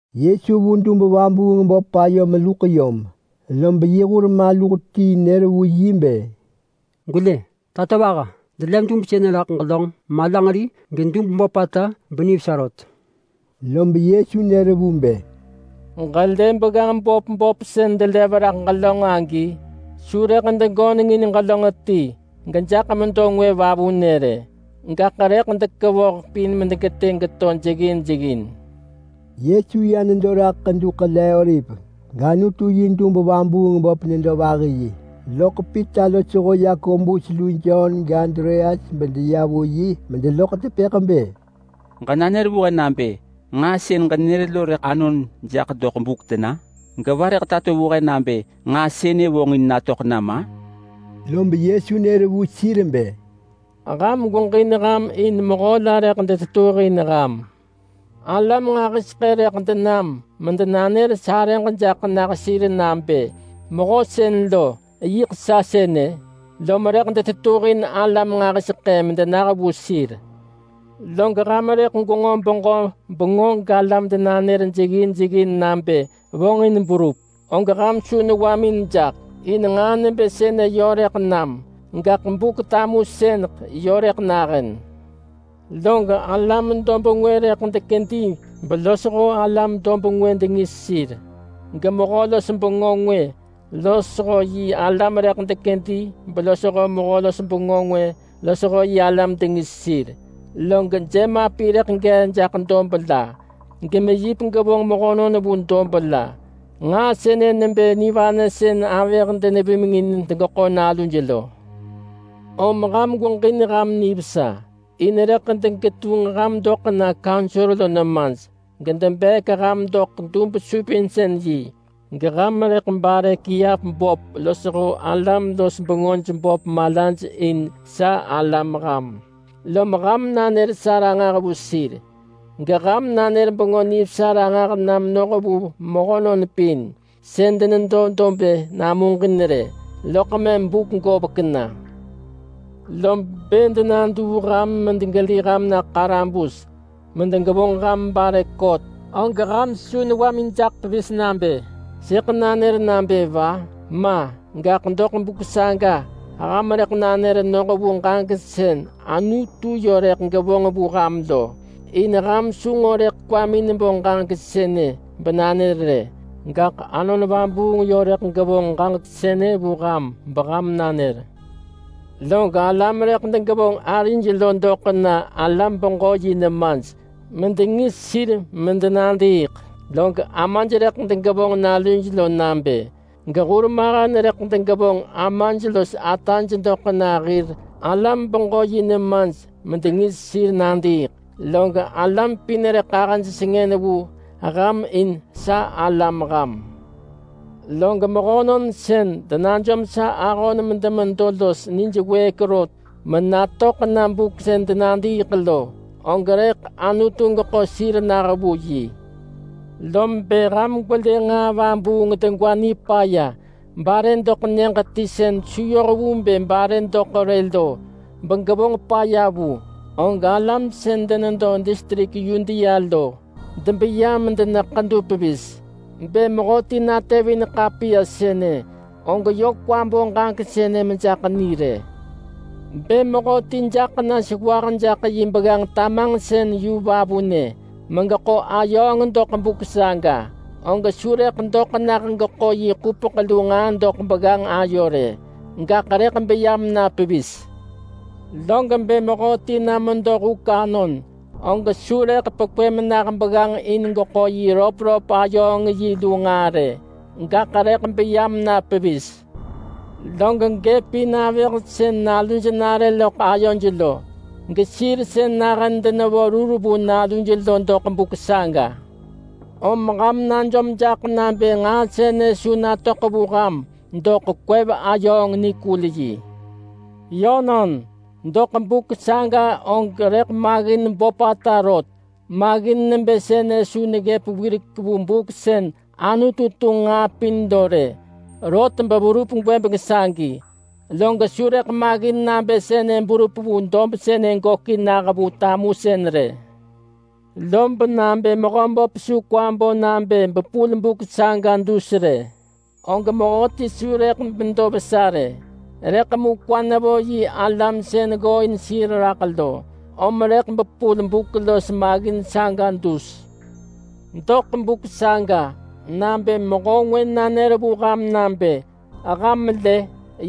Yesu vu dub-vabuung-böp ayo meluḳ yom, lob yi hur maluh ti nër vu yi bë, “Gwelë, tatovaha! Delev dub sënë raḳ ġelönġ malanġeri gedub böpata benivesa rot!” Lob Yesu nër vu bë, “Ġëlë begganġ böp böp sën delev raḳ ġelönġ agi? Su rëḳ degönengin ġelönġ ti gejaḳ medo ngwë vavunë rë. Gaḳ rëḳ dekevoh pin medegetë geto jeggin jeggin.” Yesu ya nedo raḳ Ḳedu Ḳele-oliv, gAnutu yi dub-vabuung-böp nedo vahi yi, loḳ Pita losho Yakobus lu Jon gAndreas bedeya vu yi medeloḳ tepëḳ bë, “Ġenanër vu he nabë nġaa sën ġenër lo rëḳ anon jaḳ doḳ buk tena? Geva rëḳ tato vu he nabë nġaa sënë vonġin natöḳ nam-a?” Lob Yesu nër vu sir bë, “Ham gweġin ham in mehö la rëḳ detetuhin ham! Alam nġahiseḳë rëḳ denam medenanër sarëġ jaḳ nah sir nabë, ‘Mehö sën lo, yiḳ sa sënë!’ Lob rëḳ detetuhin alam nġahiseḳë medenah vu sir. Log ham rëḳ gwenġo beġö bengö galam denanër jeggin jeggin nabë vonġin berup, og ham su newamin jaḳ, in nġaa nebë sënë yö rëḳ nam, gaḳ Buk-tamusëneḳ yö rëḳ nahën. Lob alam dob ngwë rëḳ dekedi belosho alam dob ngwë dengis sir, gemehö-los-bengö ngwë losho yi alam rëḳ dekedi belosho mehö-los-bengö ngwë losho yi alam dengis sir. Log jemapi rëḳ gee jaḳ dob la, gemeyip gevonġ mehönon vu dob la. Nġaa sënë nebë nivanë sën avëh denevimeng in degeḳo naluj lo. Om ham gweġin ham nivesa. In rëḳ degetunġ ham doḳ na kaunsor lo nemaj, gedebeek ham doḳ dub-supinsën-yi, geham rëḳ bare kiap böp losho alam-los-bengöj böp malaj in sa alam ham, lob ham nanër sa ranġah vu sir, geham nanër Bengö Nivesa ranġah na menoh vu mehönon pin sën denedo dob-ë namuġin rë, loḳ mëm buk govek na. Lob bë denaduu ham medegeli ham na ḳarabus medegevonġ ham bare kot, og ham su newamin jaḳ pevis nabë, ‘Sëḳ nanër nabë va?’ Ma! Gaḳ doḳ buk saga ham rëḳ nanër noh vu ġaġek sën Anutu yö rëḳ gevonġ vu ham lo. In ham su nġo rëḳ kwamin bo ġaġek sënë benanër rë, gaḳ Anon Vabuung yö rëḳ gevonġ ġaġek sënë vu ham beham nanër. Lob alam rëḳ degevonġ arij lo doḳ na alam-beġö-yi nemaj medengis sir medenadiiḳ, log amaj rëḳ degevonġ naluj nabë, gehurmahen rëḳ degevonġ amaj los ataj doḳ na hir alam-beġö-yi nemaj medengis sir nadiiḳ, log alam pin rëḳ ahëj sengën vu ham in sa alam ham. Log mehönon sën denajom sa ahon medemedo los nij wëëk rot menatöḳ na buk sën denadiiḳ lo, og rëḳ Anutu geḳo sir nah vu yi.” “Lob bë ham gwelë nġaa vabuung degwa nipaya bare doḳ nyëġ ti sën su yoh vu bë bare doḳ rë lo begevonġ paya vu, og alam sën denedo distrik Yudea lo debeya medena ḳedu pevis. (Bë mehöti natevin ḳapiya sënë, og yö kwa bo ġaġek sënë mejaḳ ni rë!). Bë mehöti jaḳ na sewah jaḳ yi begganġ yu tamanġsën vavunë megeḳo ayööng doḳ buk saga, og su rëḳ doḳ nah geḳo yi ḳupeḳ lu nġaa doḳ begganġ ayo rë, gaḳ rëḳ beya mena pevis. Log bë mehöti na medo huk anon, og su rëḳ pekwë menah begganġ in geḳo yi röpröp ayööng yi lu nġaa rë, gaḳ rëḳ beya mena pevis! Log gëpin avëh sën naluj nare loḳ ayoj lo, gesir sën nahën denevo rur vu naluj lo doḳ buk saga. Om ham najom jaḳ nabë nġaa sënë su natöḳ vu ham doḳ kwev-ayööng-nikul-yi. Yönon, doḳ buk saga og rëḳ maggin böpata rot. Maggin nebë sënë su neggëp wirek vu buk sën Anutu tunġ nġaa pin lo rë, rot beverup gwëbeng sagi. Log su rëḳ maggin nabë sënë berup vu dob sënë gökin nah vu tamusën rë. Lob nabë Mehöböp su kwa bo nabë bepul buk saga dus rë, og mehöti su rëḳ medo vesa rë. Rëḳ mu kwa nevo yi alam sën ggooin sir raḳ lo, om rëḳ bepul buk los maggin saga dus. Doḳ buk saga nabë mehö ngwë nanër vu ham nabë, ‘Ham lë!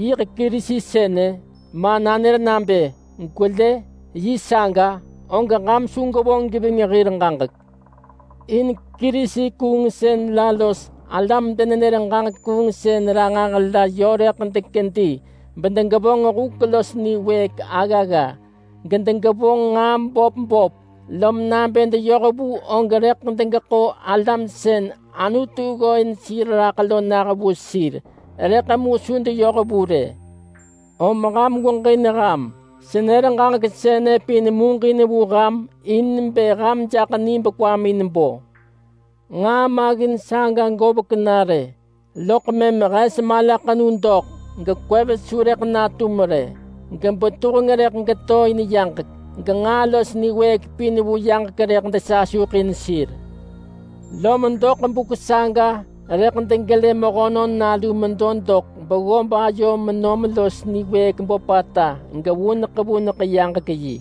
Yiḳ Kerisi sënë!’ ma nanër nabë, ‘Gwelë! Yi saga!’ og ham su gwevonġ geving hir ġaġek. In Kerisi-kuungsën la los alam denenër ġaġek kuungsën ranġah la yö rëḳ dekedi bedegevonġ huk los niwëëk aggagga, gedegevonġ nġaa böp böp, lob nabë deyoh vu og rëḳ degeḳo alam sën Anutu ggooin sir raḳ lo nah vu sir. Rëḳ mu su deyoh vu rë.” “Om ham gweġin ham. Senër ġaġek sënë pin muġin vu ham in bë ham jaḳ ni bekwamin bo. Nġaa maggin saga govek na rë, loḳ mëm ‘hes malaḳenu doḳ gekwev su rëḳ natum rë, gebetuheng rëḳ geto in yaġek, genġaa los niwëëk pin vu yaġek rëḳ desasuḳin sir.’ Lom doḳ buk saga rëḳ degelë Mehönon Nalu medo doḳ beggob ayo menom los niwëëk böpata gevuneḳ vuneḳ yaġek yi.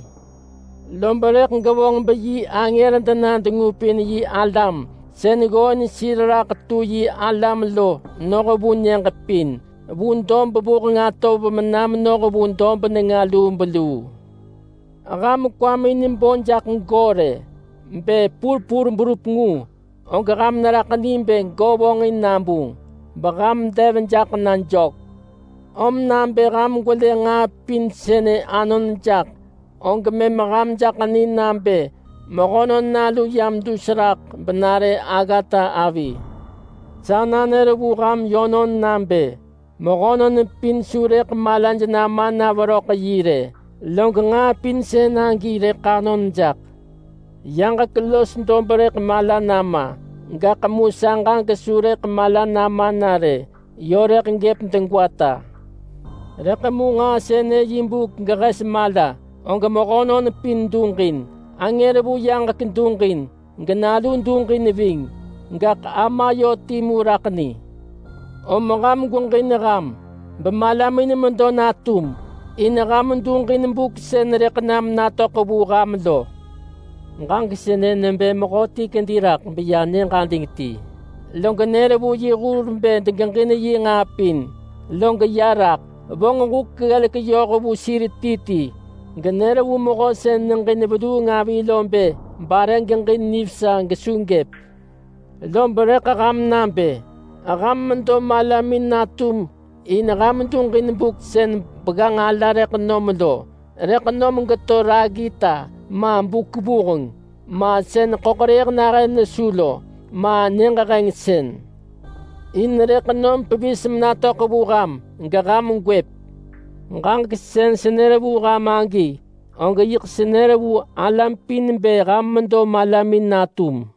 Lob rëḳ gevonġ beyi angër dena dengupin yi alam sën ggooin sir raḳ tu yi alam lo noh vu nyëġ pin. Vu dob vuheng atov mena menoh vu dob nenga lubeluu.” “Ham kwamin bo jaḳ go rë. Bë purpur berup ngu, og ham neraḳ ni bë go vonġin nabunġ beham dev jaḳ na jök. Om nabë ham gwelë nġaa pin sënë anon jaḳ, og mëm ham jaḳ ni nabë Mehönon Nalu yam dus raḳ benare aggata avi. Sa nanër vu ham yönon nabë: Mehönon pin su rëḳ malaj nama na veröḳ yi rë, log nġaa pin sën agi rëḳ anon jaḳ. Yaġek los dob rëḳ mala nama, gaḳ mu sa ġaġek su rëḳ mala nama na rë, yö rëḳ gëp degwata.” “Rëḳ mu nġaa sënë yi buk gehes mala, og mehönon pin duġin. Angër vu yaġek duġin, geNalu duġin ving. Gaḳ Ama yö timu raḳ ni. Om ham gweġin ham, bemalamin medo natum, in ham duġin buk sën rëḳ nam natöḳ vu ham lo. Ġaġek sënë nebë mehöti kedi raḳ beya nyëġ ading ti, log nër vu yi hur bë degeġin yi nġaa pin, log ya raḳ. Vonġ huk ggelek yoh vu sir ti ti genër vu mehö sën neġin veluung avi lo bë bare geġin nivesa, gesu gëp. Lob rëḳ ham nabë. Ham medo malamin natum in ham duġin buk sën begganġ ala rëḳ nom lo. Rëḳ nom geto raggita, ma buk vuheng, ma sën ḳöḳrëëh nahën nesu lo, ma nyëġ hengsën. In rëḳ nom pevis menatöḳ vu ham geham gwëp. Ġaġek sën senër vu ham agi, og yiḳ senër vu alam pin bë ham medo malamin natum!”